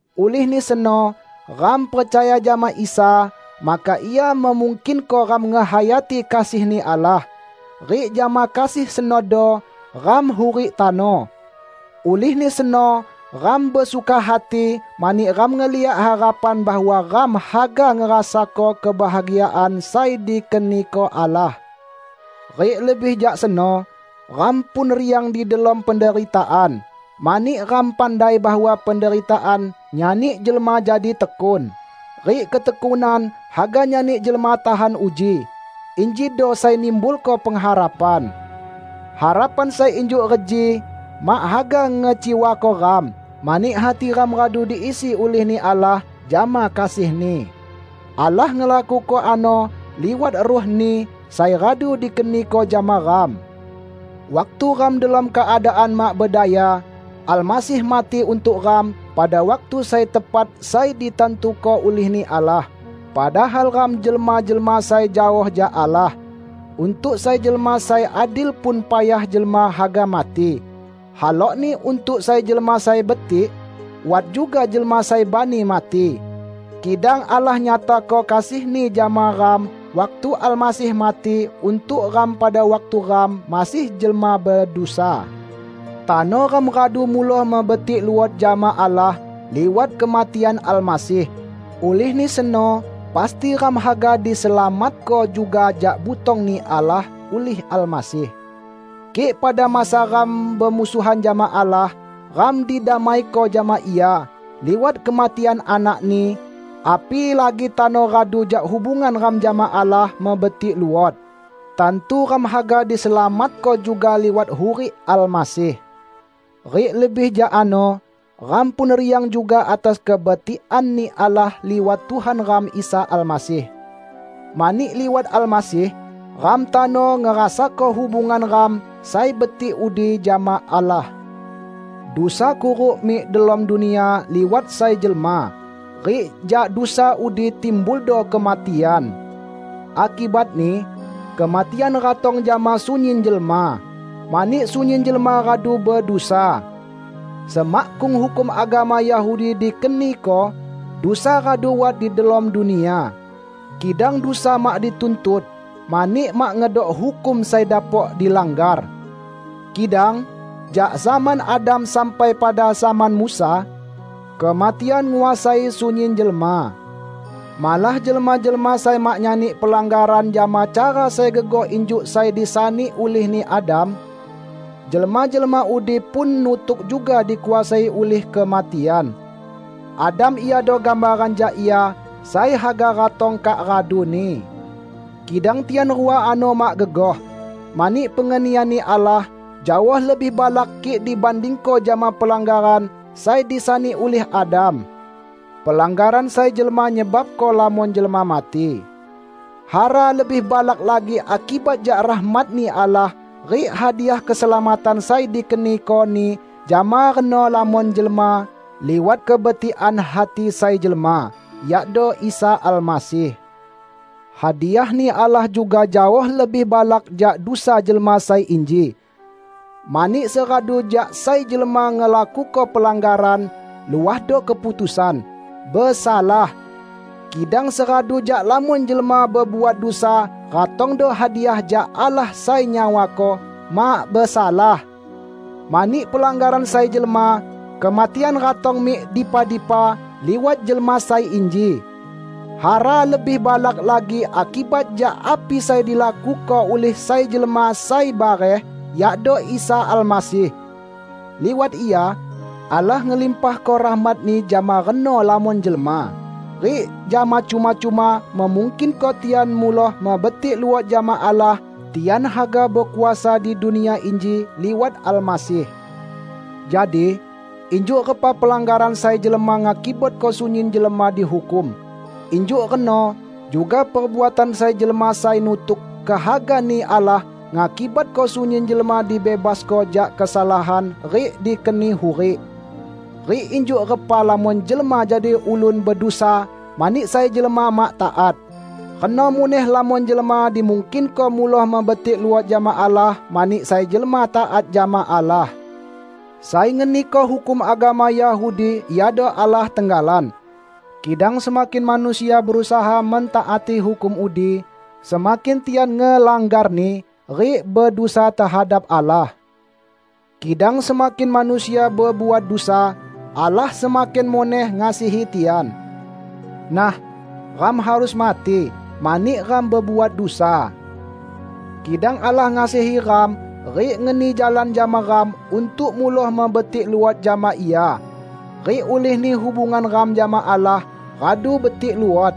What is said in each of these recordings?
Ulihni seno ram percaya jama Isa, maka Ia memungkinko ram ngehayati kasih-Ni Allah, rik jama kasih senodo ram hurik tano. Ulihni seno ram besuka hati mani ram ngeliak harapan bahwa ram haga ngerasako kebahagiaan sai dikeniko Allah. Rik lebih jak seno, ram pun riang di delom penderitaan, mani ram pandai bahwa penderitaan nyani jelma jadi tekun, rik ketekunan haga nyani jelma tahan uji; injido sai nimbulko pengharapan. Harapan sai injuk reji mak haga ngecewako ram, mani hati ram radu diisi ulih-Ni Allah jama kasih-Ni. Allah ngelakuko ano liwat Ruh-Ni, sai radu dikeniko jama ram. Waktu ram delom keadaan mak bedaya, Almasih mati untuk ram pada waktu sai tepat sai ditantuko ulih-Ni Allah; padahal ram jelma-jelma sai jaoh jak Allah. Untuk sai jelma sai adil pun payah jelma haga mati. Halokni untuk sai jelma sai betik, wat juga jelma sai bani mati. Kidang Allah nyatako kasih-Ni jama ram waktu Almasih mati untuk ram pada waktu ram masih jelma bedusa. Tano ram radu muloh mebetik luot jama Allah liwat kematian Almasih; ulihni seno pasti ram haga diselamatko juga jak butong-Ni Allah ulih Almasih. Kik pada masa ram bemusuhan jama Allah, ram didamaiko jama Ia liwat kematian Anak-Ni, apilagi tano radu jak hubungan ram jama Allah mebetik luot, tantu ram haga diselamatko juga liwat hurik Almasih. Rik lebih jak ano, ram pun riang juga atas kebetikan-Ni Allah liwat Tuhan ram Isa Almasih. Mani liwat Almasih, ram tano ngerasako hubungan ram sai betik udi jama Allah. Dusa kuruk mik delom dunia liwat sai jelma, rik jak dusa udi timbuldo kematian. Akibatni, kematian ratong jama sunyin jelma, mani sunyin jelma radu bedusa. Semakkung hukum agama Yahudi dikeniko, dusa radu wat di delom dunia. Kidang dusa mak dituntut, mani mak ngedok hukum sai dapok dilanggar. Kidang, jak zaman Adam sampai pada zaman Musa, kematian nguasai sunyin jelma. Malah jelma-jelma sai mak nyani pelanggaran jama cara sai gegoh injuk sai disani ulihni Adam, jelma-jelma udi pun nutuk juga dikuasai ulih kematian. Adam iado gambaran jak Ia sai haga ratong kak raduni. Kidang tian rua ano mak gegoh; mani pengenian-Ni Allah jaoh lebih balak kik dibandingko jama pelanggaran sai disani ulih Adam. Pelanggaran sai jelma nyebabko lamon jelma mati. Hara lebih balak lagi akibat jak rahmat-Ni Allah rik hadiah keselamatan sai dikeniko-Ni jama reno lamon jelma, liwat kebetikan hati sai jelma, yakdo Isa Almasih. Hadiah-Ni Allah juga jaoh lebih balak jak dusa jelma sai inji. Mani seradu jak sai jelma ngelakuko pelanggaran, luahdo keputusan, "Besalah". Kidang seradu jak lamon jelma bebuat dusa ratongdo hadiah jak Allah sai nyawako, "Mak besalah". Mani pelanggaran sai jelma, kematian ratong mik dipa-dipa liwat jelma sai inji. Hara lebih balak lagi akibat jak api sai dilakuko ulih sai jelma sai bareh, yakdo Isa Almasih. Liwat Ia, Allah ngelimpahko rahmat-Ni jama reno lamon jelma, rik jama cuma-cuma memungkinko tian muloh mebetik luot jama Allah; tian haga bekuasa di dunia inji liwat Almasih. Jadi, injuk repa pelanggaran sai jelma ngakibatko sunyin jelma dihukum, injuk reno juga perbuatan sai jelma sai nutuk kehaga-Ni Allah, ngakibatko sunyin jelma dibebasko jak kesalahan rik dikeni hurik. Rik injuk repa lamon jelma jadi ulun bedusa mani sai jelma mak taat, reno muneh lamon jelma dimungkinko muloh mebetik luot jama Allah mani sai jelma taat jama Allah. Sai ngeniko hukum agama Yahudi iado Allah tenggalan. Kidang semakin manusia berusaha mentaati hukum udi, semakin tian ngelanggarni rik bedusa tehadap Allah. Kidang semakin manusia bebuat dusa, Allah semakin muneh ngasihi tian. Nah, ram harus mati mani ram bebuat dusa. Kidang Allah ngasihi ram rik ngeni jalan jama ram untuk muloh mebetik luot jama Ia. Rik ulihni hubungan ram jama Allah radu betik luot,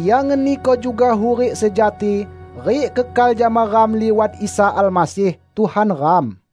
Ia ngeniko juga hurik sejati rik kekal jama ram liwat Isa Almasih, Tuhan ram.